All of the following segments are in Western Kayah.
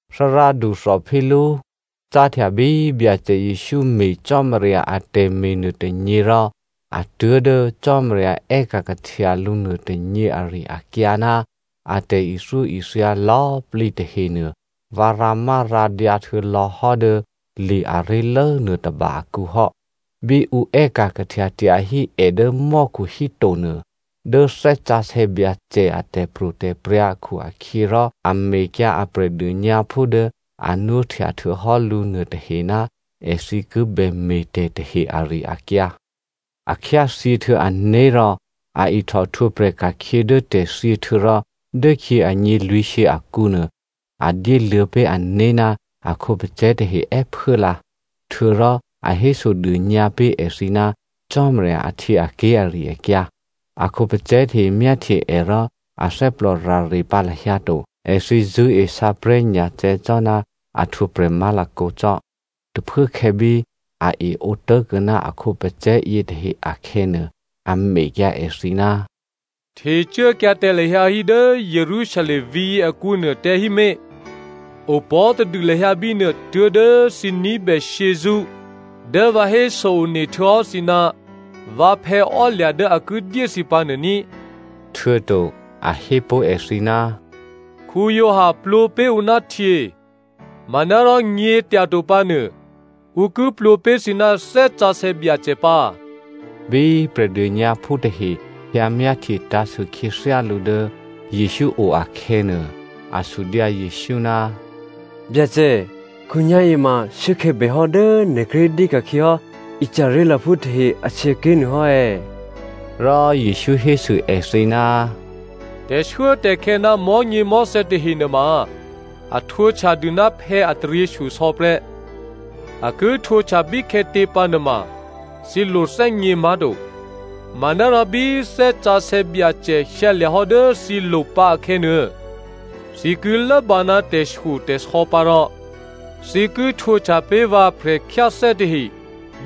Thárádu Theophilo, cáhtya bí Byacè Jesǔ me̤ Cò́marya atè̤me̤ nuôtônyě rò a tuố̤dố Cò́marya è́ka̤ kahtya lǔ nuôtônyě ari-akyǎ ná a tè̤ithyóithya lò̌꤮ plǐ tahenuô vǎ rǎmárǎdyǎ htuô̌lò̌hò́ dố li aré̤lố nuôtôba akǔ hò́. Bí ǔ è́ka̤ kahtya tyahí è dố mò́khu híto nuô, dố Thè́ Sǎsè̌ Byacè a tè̤pro̤tè̤prya̤ akhu-akhyěrò a mekyǎ a Prè̤dônyǎphú dố a nwóhtya htuô̌hò́ lǔ nuôtahe ná èthǐ ki bè me̤tè̤ tahe ari-akyǎ. A khyáthyěhtuô̌ ané̤ rò a ihtòhtwǒprè̤ ka̤khyě dố tè̤thyě htuô̌rò dốkhyě anyě lwǐ̤shyě akǔnuô, a dyéluô̌ pé̤ ané̤ ná a khǒpacè̤̌ tahe è́phuốlǎ, htuô̌rò a hésodônyǎ pé̤ èthǐ ná Cò́marya ahtyěaké̤ ari-akyǎ. A khǒpacè̤̌ tahe myáhtye è rò athè́plò rare pǎ lahyǎ to. Èthǐ zṳ̂́e sǎprè̤́nyacè̌ cò́ ná a htwǒprè̤ má̤lakǒ cò́. Tôphuốkhè̌ bí a eǒ tố̤kuô̌ ná a khǒpacè̤̌ yětahe akhè̌nuô, a mekyǎ èthǐ, “Htecuốkyǎ tǎ lahyǎ hí dố Jerusalem vǐ̤yě akǔnuô tǎ hímé̤. Opò̤́tadû lahyǎ bínuô tuố̤dố thǐ ní̤bè shyězṳ́ dố vǎ héso-one htuô̌hò́ thǐ ná vǎphè̌ ò́lya̤ dố a ki dyé thǐ pǎnuô ní꤮.” Htuô̌to a hépó̤ èthǐ, “Giovanni plwǒ pé̤ ǔ ná htyě, manárò nyě̤tyato pǎnuô ǔ ki plwǒ pé̤ thǐ ná Thè́ Sǎsè̌ Byacè pǎ.” Bí Prè̤dônyǎphú tahe hyǎ myáhtye tǎ̤sû khyěthyá lǔ dố Jesǔ o akhè̌nuô, a sudyǎ Jesǔ, “Byacè, khǒnyá̤yěma shuốkhè̌ bèhò́ dố nè̤ kíré̤ dyéka̤khyě hò́ Israelphú tahe ahtyěké̤ nuô hò́ è̌?” Rò Jesǔ hésû èthǐ, “Tè̤shuốtè̤khè̌ ná mò̤́nyěmò̤́thè̌ tahe nuôma a htwǒhtyadû ná phè̌ a taryěshyosò̌ prè́. A ki htwǒhtya bíkhè̌tě pǎ nuôma, thǐ lo thè́gně má̤to. Manárò bí Thè́ Sǎsè̌ Byacè hyǎlya̤hò́ dố thǐlo̤ pǎ akhè̌nuô, thǐ ki lốbǎ ná tè̤shyotè̤sò̌ pǎ rò thǐ ki htwǒhtya pé̤ vǎ prè̤khyáthè́ tahe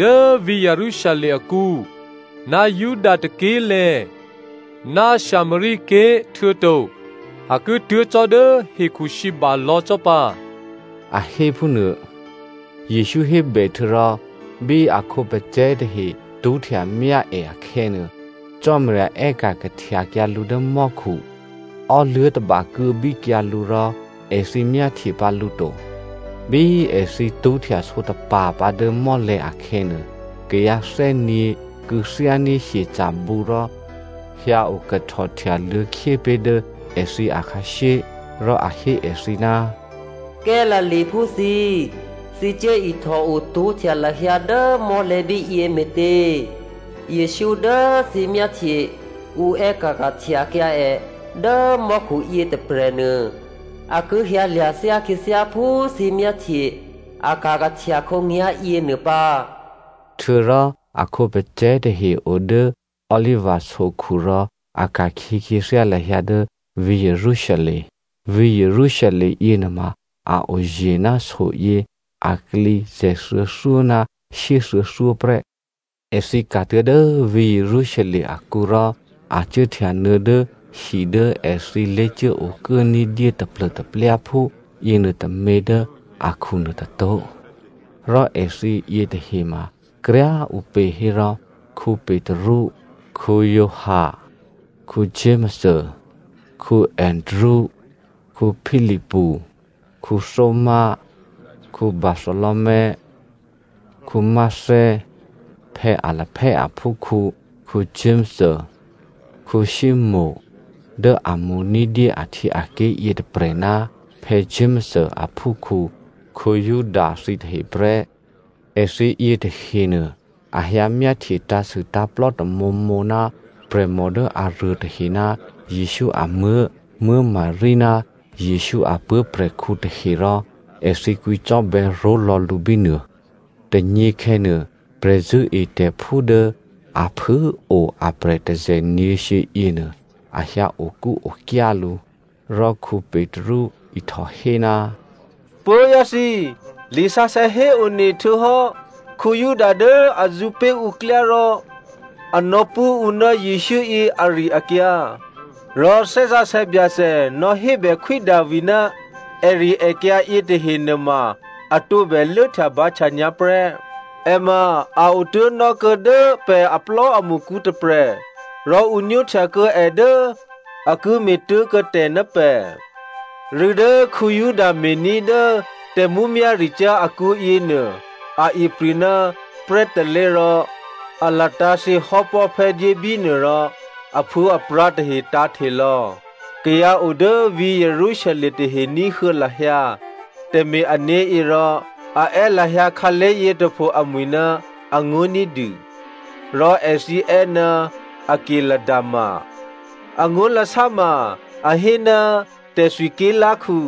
dố vǐ̤ Jerusalem akǔ, ná Juda tôké̤꤮ lè̤̌, ná Samaria ké̤ htuô̌to a ki tuố̤ cò́dố hekhusǐba lò̌ cò́ pǎ,” a héphúnuô. Jesǔ hébè htuô̌rò bí a khǒpacè̤̌ tahe tṳ́htyamyá è akhè̌nuô, Cò́marya è́ka̤ kahtyakyǎ lǔ dố mò́khu. Ò́luố̤ tôba kuô̌bíkyǎ lǔ rò èthǐ myáhtye pǎ lǔ to. Bí èthǐ tṳ́htya sǒtapa̤ pǎ dố mò́lè̤̌ akhè̌nuô, kayǎthè́nyě̤ kû̌thyání̤ hyeca̤bǔ rò hyǎokahtò htyaluô̌khyé pé̤ dố èthǐ akhǎshyé. Rò a hé èthǐ, “Galileaphú thǐ꤮ thǐ cuố ihtòo tṳ́htya lahyǎ dố mò́lè̤̌ bíyě me̤tě? Jesǔ dố thǐ myáhtye ǔ è́ka̤ kahtyakyǎ è dố mò́khu yětôprè̤nuô a ki hyǎlya̤ thyá khyěthyá phú thǐ myáhtye a ka̤kahtya khǒnyá̤yěnuô pǎ.” Htuô̌rò a khǒpacè̤̌ tahe o dố Oliva sokhu rò a ka̤khyě khyěthyá lahyǎ dố vǐ̤ Jerusalem. Vǐ̤ Jerusalem yěnuôma a oye̤ ná soyě aklǐ zè̤thuô̌thyó ná shyéthuô̌thyó prè́. Èthǐ ka̤tuố̤ dố vǐ̤ Jerusalem akǔ rò a cuốhtyanuô̌ dố hi dố èthǐ lé̤cuốokuố ní̤dyé taplô̤taplyáphú yěnuôtômě dố akhunuô tôtó̤. Rò èthǐ yětahema kryá꤮ ǔpě hérò Petru, Giovanni, Jakomo, Andrea, Philipu, Thomazo, Bartholomeo, Matteo, Alphaeo aphúkhǔ Jakomo, Simonè dố a mo̤ ní̤dyé ahtyěaké̤ yětôprè̤ ná Jakomo aphúkhǔ Juda thǐtahe prè́. Èthǐ yětahenuô a hyǎ myáhtye tǎ̤sû tǎ̤plò́ tamǒmǒ ná prè̤mò dố aruôtahe ná Jesǔ amuố̤ Maria ná Jesǔ a puố̤prè̤khǔ tahe rò èthǐ kwǐcò́bè̌ ró̤lò̌ lǔ bínuô. Tônyěkhè̌nuô, prè̤zṳ̂́etè̤phú dố a phû꤮ o aprè̤ tôzè̤nyě̤shyě yěnuô a hyǎ okúokyá lǔ. Rò Petru ihtòhé, “Puố̤vyá̤ thǐ꤮, lisǎsè̌ héone htuô̌hò́ Juda dố a zṳ̌ pé̤ ǔ klyá rò a nò̌pṳ̂́ ǔ ná Jesǔ yě ari-akyǎ. Rò Thè́ Sǎsè̌ Byacè nò̌hébè Khwí Davi ná èrièkyǎ yětahe nuôma a tǒbè lốhtyabǎhtya nyǎ prè́. È ma a otố̤nò́kuô̌ dố pè̤ aplò́amṳkǔ tôprè̤ rò ǔ nwóhtya kuô̌ è dố a ki me̤tố̤kuô̌ tè̤ ná pè̤.” (Rû̌ dố Juda me̤ní̤ dố tè̤mǔmyá̤ricyá̤ akǔ yěnuô a ipri̤ ná prè́ tôlé̤ rò a latǎ̤thyě hò́pò̤́phè́ dyé bínuô rò aphuô̌aprǎ̤ tahe tǎ̤hte lò̌. Kayǎ o dố vǐ̤ Jerusalem tahe ní̤huô̌ lahyǎ tè̤me̤-ané̤ yě rò a è́ lahyǎ khǎlé̤ yětôpho amwi̤ ná angó̤ ní̤dû. Rò èthǐ è́ ná “Akeldama,” angó̤lasá ma a hé ná “Tè̤thwi ké̤lá̤khu”)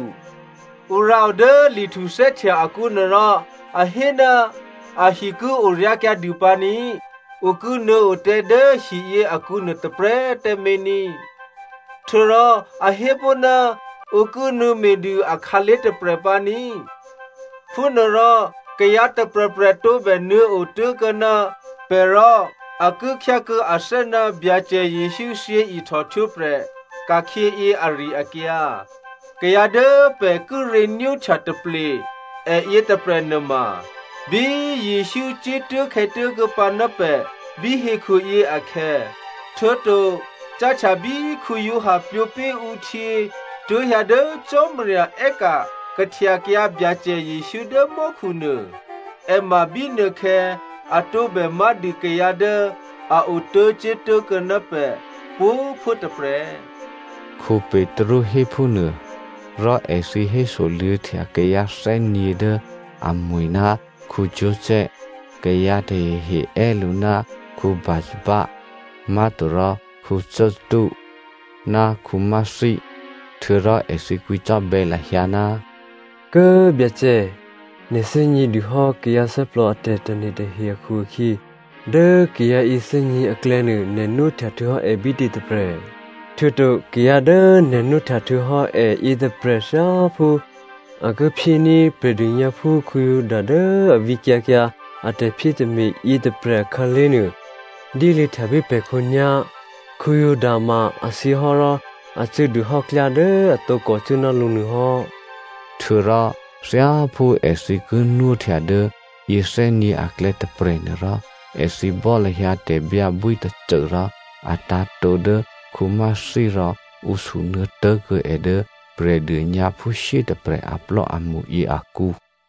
“Ǔ rǎo dố Li Htuthè́htya akǔnuô rò a hé, ‘Ahi ki oryá̤kyǎ dû pǎ ní꤮ ǔ ki nuô̌o tǎ dố hiyě akǔnuô tôprè̤꤮ tǎmé̤ ní꤮.’ “Htuô̌rò a hépó̤, ‘Ǔ ki nuô̌me̤dû akhǎlé̤ tôprè̤ pǎ ní꤮.’ “Phúnuôrò kayǎ tôprè̤prè̤ tǒbè nuô̌ otố̤kuô̌ ná pè̤ rò a ki khyá kuô̌ athè́ ná Byacè Jesǔ thyěihtò htwǒprè̤ ka̤khyěyě ari-akyǎ. Kayǎ dố pè̤ kíré̤ nwóhtya taple è yětôprè̤ nuôma, bí Jesǔ cuốtố̤khè̌tố̤ kuô̌pǎ ná pè̤ bí hekhuyě akhè̌, htuô̌to cáhtya bí Giovanni plwǒ pé̤ ǔ htyě tuố̤ hyǎ dố Cò́marya è́ka̤ kahtyakyǎ Byacè Jesǔ dố mò́khunuô, è ma bínuôkhè̌ a tǒbè má̤dû kayǎ dố a otố̤cuốtố̤ kuô̌ ná pè̤ pwǒ̤꤮ phuố tôprè̤,” Petru hé phúnuô. Rò èthǐ hésoluô̌htya kayǎ thè́nyě̤ dố amwi̤ ná Joseph, kayǎ tahehe è́ lǔ ná Barsabba (Má̤torò Justo) ná Mathia. Htuô̌rò èthǐ kwǐcò́bè̌ lahyǎ, “Kố꤮ Byacè꤮ nè̤ thè́gně dûhò́ kayǎ thè́plò a tè̤tane̤ tahe akhu-akhyě, dố kayǎ yěthè́nyě̤ aklè̌nuô nè̤ nwóhtya htuô̌hò́ è bítě tôprè̤, htuô̌to kayǎ dố nè̤ nwóhtya htuô̌hò́ è yětôprè̤ thyáphú a ki phyéní̤ Prè̤dônyǎphú Juda dố a vǐkyǎ kyǎ a tè̤phyétè̤me̤ yětôprè̤ akhǎlé̤ nuô, dyéluô̌htya pé̤ pè̤ khǒnyá̤. Juda ma a thyěhò́ rò a cuố dûhò́ klyá dố a tǒkò cuố ná lǔ nuôhò́.” Htuô̌rò thyáphú èthǐ ki nwóhtya dố yěthè́nyě̤ aklè̌ tôprè̤ nuôrò èthǐ bò́ lahyǎ tè̤byǎbwí tôcô rò a tǎ̤tǒ dố Mathia rò ǔ sunuô̌ tố̤kuô̌ è dố Prè̤dônyǎphú shyétôprè̤ aplò́amṳyě akǔ.